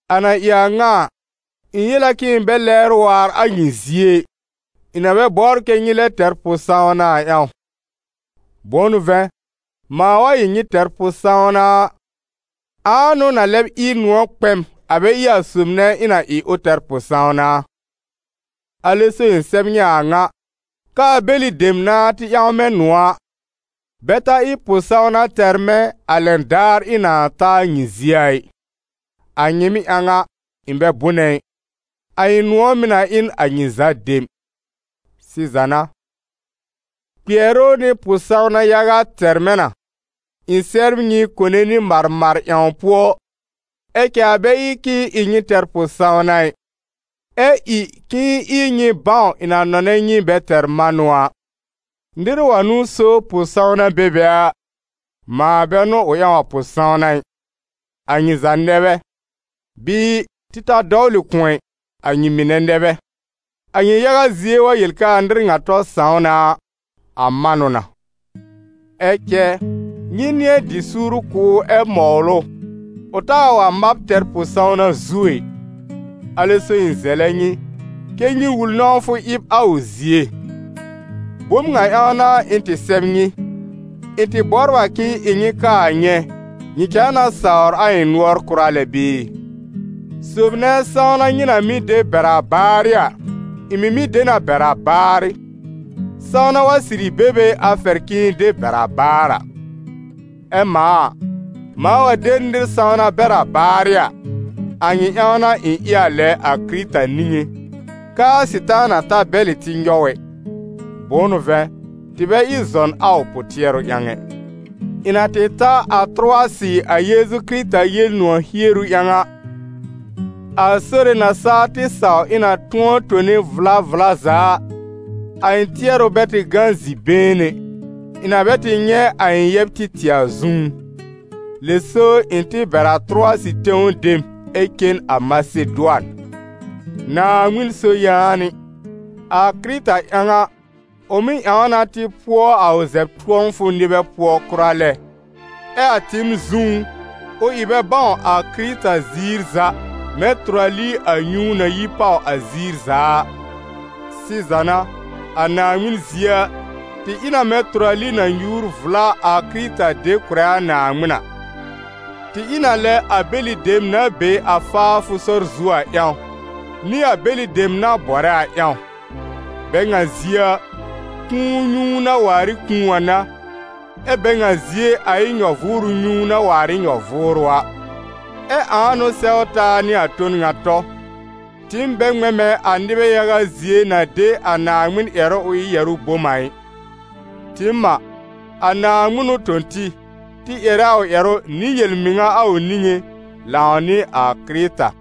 A na ɩ a ŋa a, ɩ̃ yel a k'ɩ̃ɩ bɛ lɛbr waar a nyɩ zie ɩ, ɩ̃ na bɛ bɔbr kɛ́ nyɩ lɛb tɛr pʋ-sãwna a ƴãw. Bʋ̃ʋ n'ʋ vɛ̃, mãa wa ɩ nyɩ tɛr pʋ-sãwna a, ãa n'ʋ na lɛb ɩ nʋ̃ɔ̀ kpɛ m, a bɛ ɩ a sob nɛ ɩ̃ na ɩ ʋ tɛr pʋ-sãwna a? Alɛ so ɩ̃ sɛb nyɩ a a ŋa, k'aa bɛlɩ dem nãá tɩ ƴãw mɛ̃ nʋ̃ɔ̀ a, bɛ ta ɩ pʋ-sãwna tɛr mɛ̃ a lɛn daar ɩ̃ nãa ta a nyɩ zie a ɩ. A nyɩɩm ƴãw a, ɩ̃ bɛ bʋnɛ ɩ, a ɩ̃ nʋ̃ɔ̀ mɩ̀ na ɩ n a nyɩ za dem. Sɩza n'a, kpɩɛrʋ nɩ pʋ-sãwna yaga tɛr mɛ̃ na, ɩ̃ sɛbr nyɩ kone nɩ marmar ƴãw pʋɔ, ɛ cɛ a bɛ ɩ k'ɩ̃ɩ ɩ nyɩ tɛr pʋ-sãwna ɩ, ɛ ɩ k'ɩ̃ɩ ɩ nyɩ bãw ɩ̃ na nɔnɛ nyɩ bɛ tɛr manʋ a. Nɩr wa n'ʋ so pʋ-sãwna be be a, mãa bɛ n'ʋ ʋ ƴãw a pʋ-sãwna ɩ, a nyɩ za nɛ bɛ, bɩɩ, tɩ ta dɔwlɩ kʋ̃ɔ ɛ, a nyɩ mɩnɛ nɛ bɛ. A nyɩ yaga zie wa yel k'aa nɩr ŋa tɔ sãw na a, a man ʋ na. Ɛ cɛ nyɩ nɩ̃ɛ dɩ suur kʋ̀ ʋ ɛ mɔwl ʋ, k'ʋ taa wa mab tɛr pʋ-sãwna zuo ɛ. Alɛ so ɩ̃ zɛlɛ nyɩ, kɛ́ nyɩ wul nɔ̃wfʋ ɩb a ʋ zie. Bom ŋa ƴãw n'a ɩ̃ tɩ sɛb nyɩ: ɩ̃ tɩ bɔbr a k'ɩ̃ɩ ɩ nyɩ kaa nyɛ̃, nyɩ cãa na sawr a ɩ̃ nʋɔr kʋra lɛ bɩɩ. Sob nɛ sãwna nyɩ na mɩ́ de bɛr a baarɩ a, ɩ̃ mɩ̀ mɩ́ de na bɛr a baarɩ, sãwna wa sɩrɩ be be a fɛr k'ɩ̃ɩ de bɛr a baar a. Ɛ mãa a, mãa wa de nɩr sãwna bɛr a baarɩ a, a nyɩ ƴãw n'a ɩ̃ ɩ a lɛ a Kɩrɩta niŋé, k'aa Sɩtaana ta bɛ̀lɩ tɩ nyɔw ɛ; bʋ̃ʋ n'ʋ vɛ̃, tɩ bɛ ɩ zɔn a ʋ pʋ-tɩɛrʋ ƴãw ɛ. Ɩ̃ na tɩ ta a Tʋrʋwasɩ a Yeezu Kɩrɩta Yel-nʋ̃ɔ̀ hieru ƴãw a, a Sore na saa tɩ saw ɩ̃ na tʋ̃ɔ tone vla vla za a, a ɩ̃ tɩɛrʋ bɛ tɩ gã zi-been ɛ, ɩ̃ na bɛ tɩ nyɛ̃ a ɩ̃ yɛb Títɩ̀ a zũú. Lɛ so ɩ̃ tɩ bɛr a Tʋrʋwasɩ tẽw dem ɛ cen a Masedʋan. Naaŋmɩn so yaanɩ! A Kɩrɩta ƴãw a, ʋ mɩ́ ƴãw na tɩ pʋɔ a ʋ zɛb-tʋ̃ɔfʋ nɩbɛ pʋɔ kʋra lɛ, ɛ a tɩɩm zũú, ʋ ɩ bɛ bãw a Kɩrɩta ziir za mɛ̃ tʋrali a nyũu na yi pàw a ziir za a. Sɩza n'a a Naaŋmɩn zie a, tɩ ɩ na mɛ̃ tʋrali na nyuur vla a Kɩrɩta de kʋ̀rɛ a Naaŋmɩn a. Tɩ ɩ n a lɛ a bɛlɩ dem na be a faafʋ sɔr zu a ƴãw, nɩ a bɛlɩ dem na bɔrɛ a ƴãw. Bɛ ŋa zie a, kũu nyũu na waar ɩ kũu a n'a, ɛ bɛ ŋa zie a ɩ nyɔ-vʋʋrʋ nyũu na waar ɩ nyɔ-vʋʋrʋ a. Ɛ ãa n'ʋ sɛw taa nɩ a ton ŋa tɔ? Tɩɩm bɛ ŋmɛ̃ mɛ̃ a nɩbɛ yaga zie na de a Naaŋmɩn ƴɛrʋ ʋ ɩ yɛ̀rʋ́ bom a ɩ. Tɩɩm a, a Naaŋmɩn n'ʋ tõ tɩ, tɩ ƴɛrɛ a ʋ ƴɛrʋ nɩ yel-mɩŋa a ʋ niŋé, lãw nɩ a Kɩrɩta.